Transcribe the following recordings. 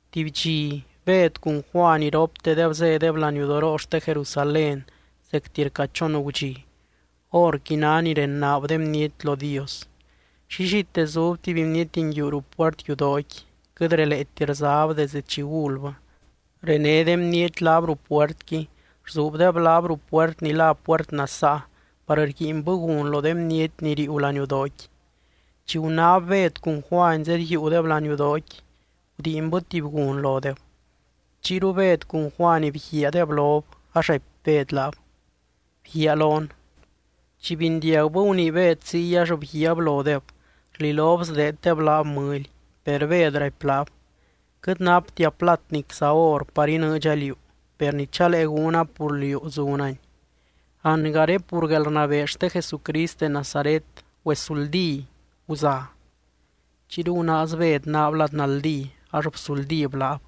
Tuby dxi, Bed cun Juany iroptedeb zédeb laniudoroo xte Jerusalén zecti rca chon gudxi. Horqui ná ni renaab de bniety lo Dios. Llillite zub tuby bniety nguiu ruu puert yudooqui, quɨt releeti rzab desde chi gulbɨ. René de bniety laab ruu puertqui, rzuubdeb laab ruu puert ni lá Puert Nasaa par rguiinbɨ gun lo de bniety ni riiu laniudooqui. Chi gunáb Bed cun Juany zedyiiudeb laniudooqui, gudiinbɨ tuby gun lodeb. Chiyru Bed cun Juany bguiaadeb lob, ax raipy Bed laab: —Bguiaa lon. Chi bindiagbɨ gunii Bed ziy ax bguiaab lodeb, rlilob sdeeddeb laab mɨly. Per Bed raipy laab: —Quɨt naptia plat nicza or par inɨɨdxa liú, per ni chalee gúna pur liú zunani: Angaré pur guelrnabee xte Jesucrist de Nazaret, güesuldí, guza. Chiyru gunaaz Bed naab lad naldí ax bsuldíb laab.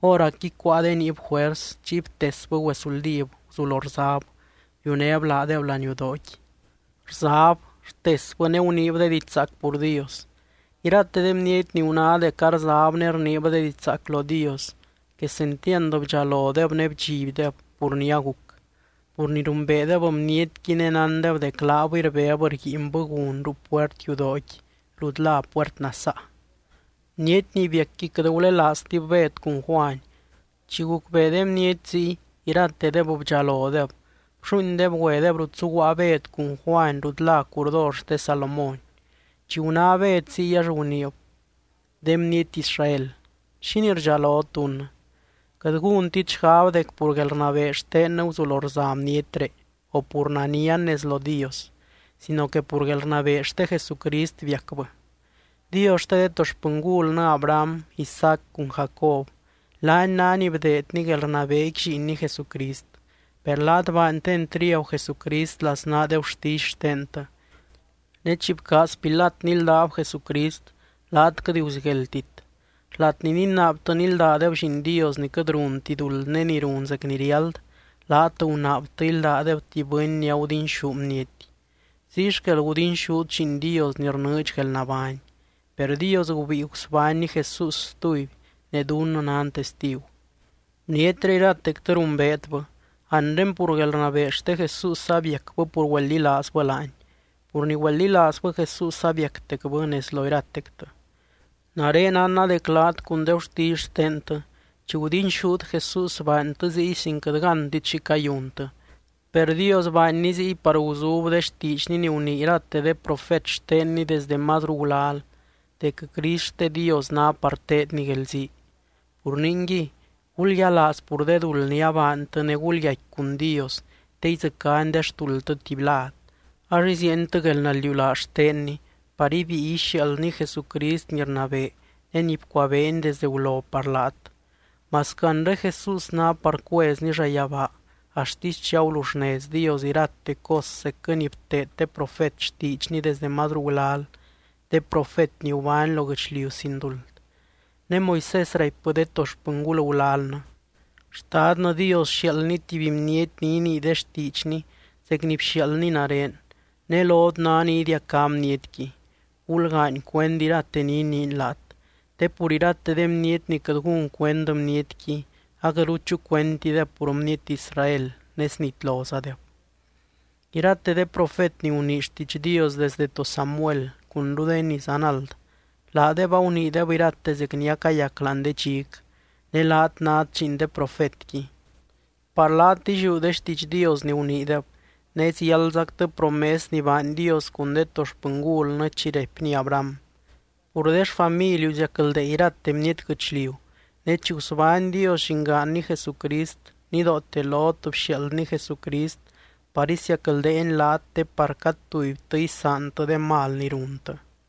Hóracqui cuáa de niib juers. Chiy btesbɨ güezuldíb, guzulo rzab, biunéb laadeb laniudooqui. Rzab, rtesbɨ ne guniib diidx zaac pur Dios. Irate de bniety ni guná dec arzab ne rniib de diidx zaac lo Dios, quesentiand bdxalodeb ne bdxibdeb pur ni aguc, pur ni rumbeedeb bnietqui ne nándeb dec laabɨy rbeb rguiinbɨ gun ruu puert yudooqui rut lá Puert Nasaa. Bniety ni biacqui quɨt gulelaaztib Bed cun Juany. Chi gucbee de bniety ziy, iratedeb bdxalodeb. Blluuindeb güedeb rut zuguaa Bed cun Juany rut lá curdor xte Salomón. Chi guná Bed ziy ax guniib: —De bniety Israel, ¿xínii rdxalot dunnɨ? Quɨt gúntit xgab dec pur guelrnabee xtennɨ guzulo rza bnietré, o pur nanian nez lo Dios sino que pur guelrnabee xte Jesucrist biacbɨ. Dios xte de to xpɨngulnɨ Abraham, Isaac cun Jacob, laany ná ni bdeedny guelrnabeequi Lliinny Jesucrist. Per laat baantɨ entriagu Jesucrist laznaa de gurtisy xtentɨ. Ne chi bcaaz Pilat níldab Jesucrist, laat quɨt guzigueldtit. Xlat ni ninaabtɨ níldadeb Lliin Dios ni quɨt runti duld ne ni run zec ni riáld, laat gunaabtɨ íldadeb tuby bɨny ni agudinxú bniety. Ziy xquel gudinxút Lliin Dios ni rnɨɨdx guelnabány, per Dios gubíi gusbánny Jesús stuby ne dunnɨ nan testigu. Bnietré iratectɨ rumbeetbɨ, anre pur guelrnabee xte Jesús abiacbɨ pur güeldilaazbɨ laany, pur ni güeldilaazbɨ Jesús abiactecbɨ nez lo iratectɨ. ’Nare nánna dec laat cun de gurtisy xtentɨ, chi gudinxút Jesús baantɨ ziy sin quɨt gántit xi cayuntɨ. Per Dios baanny ziy par guzub de xtiidxny ni gunii irate de profet xtenny desdɨ mazru gulal: dec Crist xte Dios ná par teedny guelzii. Pur ningui, gulyialaaz pur de duld ni abaantɨ ne gulyaicqui cun Dios te idzɨcány de xtuldtɨ tuby lad. Ax iziientɨ guelnaldiulaaz xtenny par ibíi ixiaaldny Jesucrist ni rnabee ne ni bcuabeeny desde gulo par laat. Masquɨ anre Jesús ná par cuezny llayabaa axtisy chi aguluxnez Dios irate cos zecquɨ ni bteed de profet xtiidxny desdɨ mazru gulal, de profet ni gubány lo guɨchliu sin duld. Ne Moisés raipbɨ de to xpɨngul gulalnɨ: “Xtadnɨ Dios sxiaaldny tuby Bniety ni inii de xtiidxny zec ni bxiaaldny nare, ne lot ná ni idiacá bnietqui. Gulgaany cuend irate ni iniiny laat, te pur irate de bniety ni quɨt gún cuend Bnietqui, aquɨtru chucuentideb pur bniety Israel ne snitlozadeb.” ’Irate de profet ni gunii xtiidx Dios desdɨ to Samuel cunru de ni zanald, laadeb aguniideb irate zec ni acayac láani de dxic. Ne laat nát lliin de profetqui. Par laat illiú de xtiidx Dios ni guniideb, ne ziáldzactɨ promes ni baany Dios cun de to xpɨngulnɨ chi raipny Abraham: “Pur de xfamiliu, ziacldee irate bniety guɨchliu.” Ne chi gusbány Dios llingaanny Jesucrist, nidoote lot bxiaaldny Jesucrist par isiacldeeny laat te par cad tubytɨ isaantɨ de mal ni runtɨ.